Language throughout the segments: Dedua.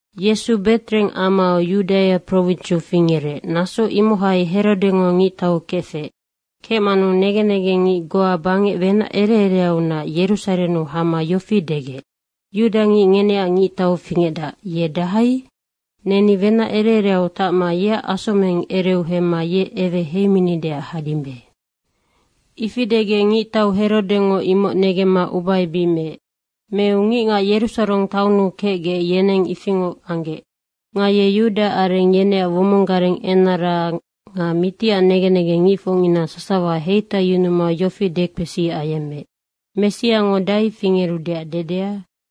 Yesu Betreheng amau Yudaia prowinsiu fingerec, naso imohai Herodengo ngictau kefec. Kecmanu negen negengngic goa bangec wenac ere ereaunac Yerusarennu hama yofi degec, “Yudangic ngeneac ngictau fingecdac, ye dahai? Neni wenac ere ereau tacma yeac asomeng ereu hemma ye eweheiminideac hadimbe.” Ifi degec ngictau Herodengo imoc negemma ubaebic meec. Meu ngicngac Yerusareng taonnu kecgec, yeneng ifingoc anggec. Nga ye yudaareng yeneac womong gareng enara nga mitiac negen negengngicfocngina sasawa heitaiyunuma yofi dekpesi ayemmeec, “Messiango dahai fingerudeac dedea?”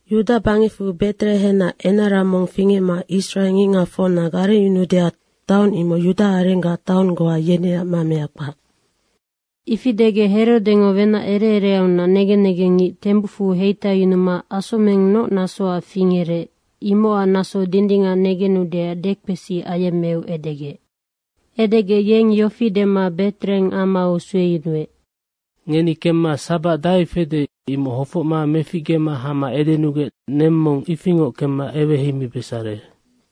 ‘Yuda bangecfu Beterehennac enara mong fingecma israengicngacfocna garengyunuudeac taong imoc yudaarenggac taong goa yeneac mamea kpac.’” Ifi edegec Herodengo wenac ere ereaunac negen negengngic tembucfu heitaiyunuma asomeng noc nasoac fingerec, imocac naso dindingac negenudeac dekpesi ayemmeu edegec. Edegec yeng yofi dema Betreheng amau sueyunuec, “Ngeni kemma sabac dahai fede, imoc hofocma meficgema hama edenugec neng mong ifingoc kemma eweheimibesare.”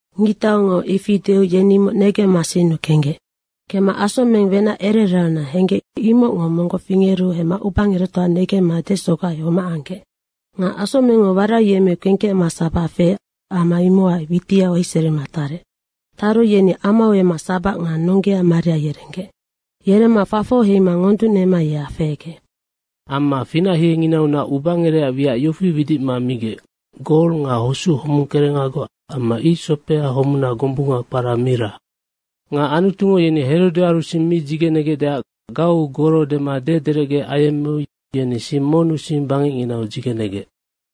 Ngictaungo ifi deu yeni imoc negemma sinnu kenggec. Kemma asomeng wenac ere ereau henggec, imocngo monggoc fingeru hemma ubangerectoa negemma desogai homac anggec. Nga asomengngo waraiyemmeu kengkecma sabac feec, ama imocac witiau heiserima tarec. Taru yeni amau emma sabac nga nonggea Maria yerenggec. Yeremma fafoc heima ngonducnema ye afehegec. Amma finachienginaunac ubangerecac wiac yofi widicma migec, gol nga hosuc homungkerengagoc amma icsopea homuna gombunga kpara mira. Nga Anutungo yeni Herodearu sing mi dzigenegecdeac gauu goro dema dederecge ayemmeu yeni sing monnu sing bangecnginau dzigenegec.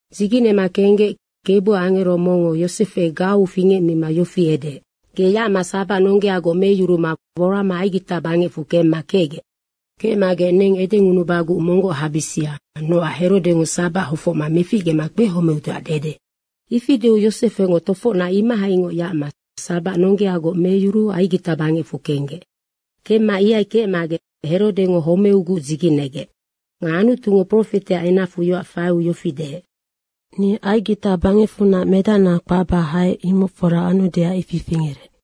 Dzigenema kenggec Kebuac angero mongngo Yosefe gauu fingecmima yofi edeec, “Ge yacma sabac nonggeagoc meyuruma worama Aigita bangecfu kemma kecgec. Kecmagec neng edengunubaguc monggoc habisia, nocac Herodengo sabac hofocma meficgema kpehomeudeac dede.” Ifi deu Yosefengo tofocnac imohaingoc yacma sabac nonggeagoc meyuruu Aigita bangecfu kenggec. Kemma ihai kecmagec Herode homeuguc dzigenegec. Nga Anutungo profeteac enacfu yoac faiu yofi deec, “Ni Aigita bangecfunac medacna kpacba haec.” imoc fora anudeac ifi fingerec.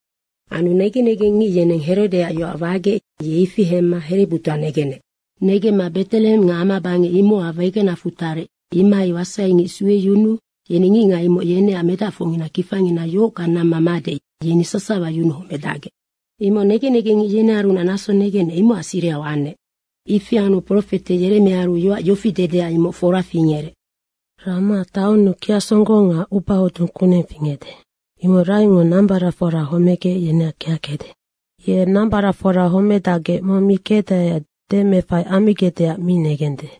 Anu negen negengngic yeneng Herodeac yoac wagec, ye ifi hemma herebutoa negenec. Negemma Betreheng nga amabangec imocac wegenacfu tarec, imohai wasaingic sueyunuu yeni ngicngac imoc yeneac medacfocngina kifangina yohockang namma made, yeni sasawa yunuhomedacgec. Imoc negen negengngic yenearunac naso negenec, imocac sirihau anec. Ifi anu profete Yeremiaaru yoac yofi dedea, imoc fora fingerec. “Raama taonnu kiacsonggong nga ubahodung kuneng fingecde. Imoc Rahengo nambaracfora homegec, yeneac kiackecde. Ye nambaracfora homedacgec mong mi kecdaeac demeefai ammigecdeac mi negende.”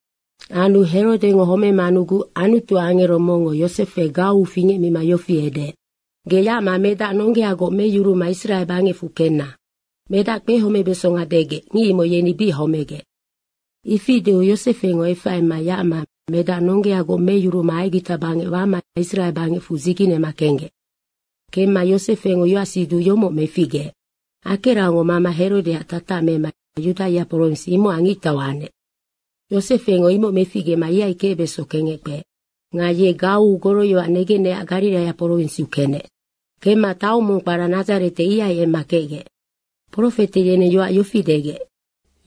Anu Herode homemanuguc Anutuac angero mongngo Yosefe gauu fingecmima yofi edeec, “Ge yacma medac nonggeagoc meyuruma Israe bangecfu kenna, medac kpehomebesonga degec, ngic imoc yeni bic homegec.” Ifi deu Yosefengo efaima yacma medac nonggeagoc meyuruma Aigita bangec wama Israe bangecfu dzigenema kenggec. Kemma Yosefengo yoacsiduc yomoc meficgeec, “Akeraongo mama Herodeac tatac mema Yudaia prowins, imocac ngictau anec.” Yosefengo imoc meficgema ihai kecbeso kengec kpeec. Nga ye gauu goroyoac negenecac Gariraia prowinsiu kenec. Kemma taong mong kpara Nadzarete, ihai emma kecgec. Profete yeneng yoac yofi degec,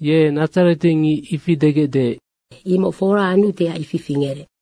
“Ye nadzaretengic, ifi degecde.” imoc fora anudeac ifi fingerec.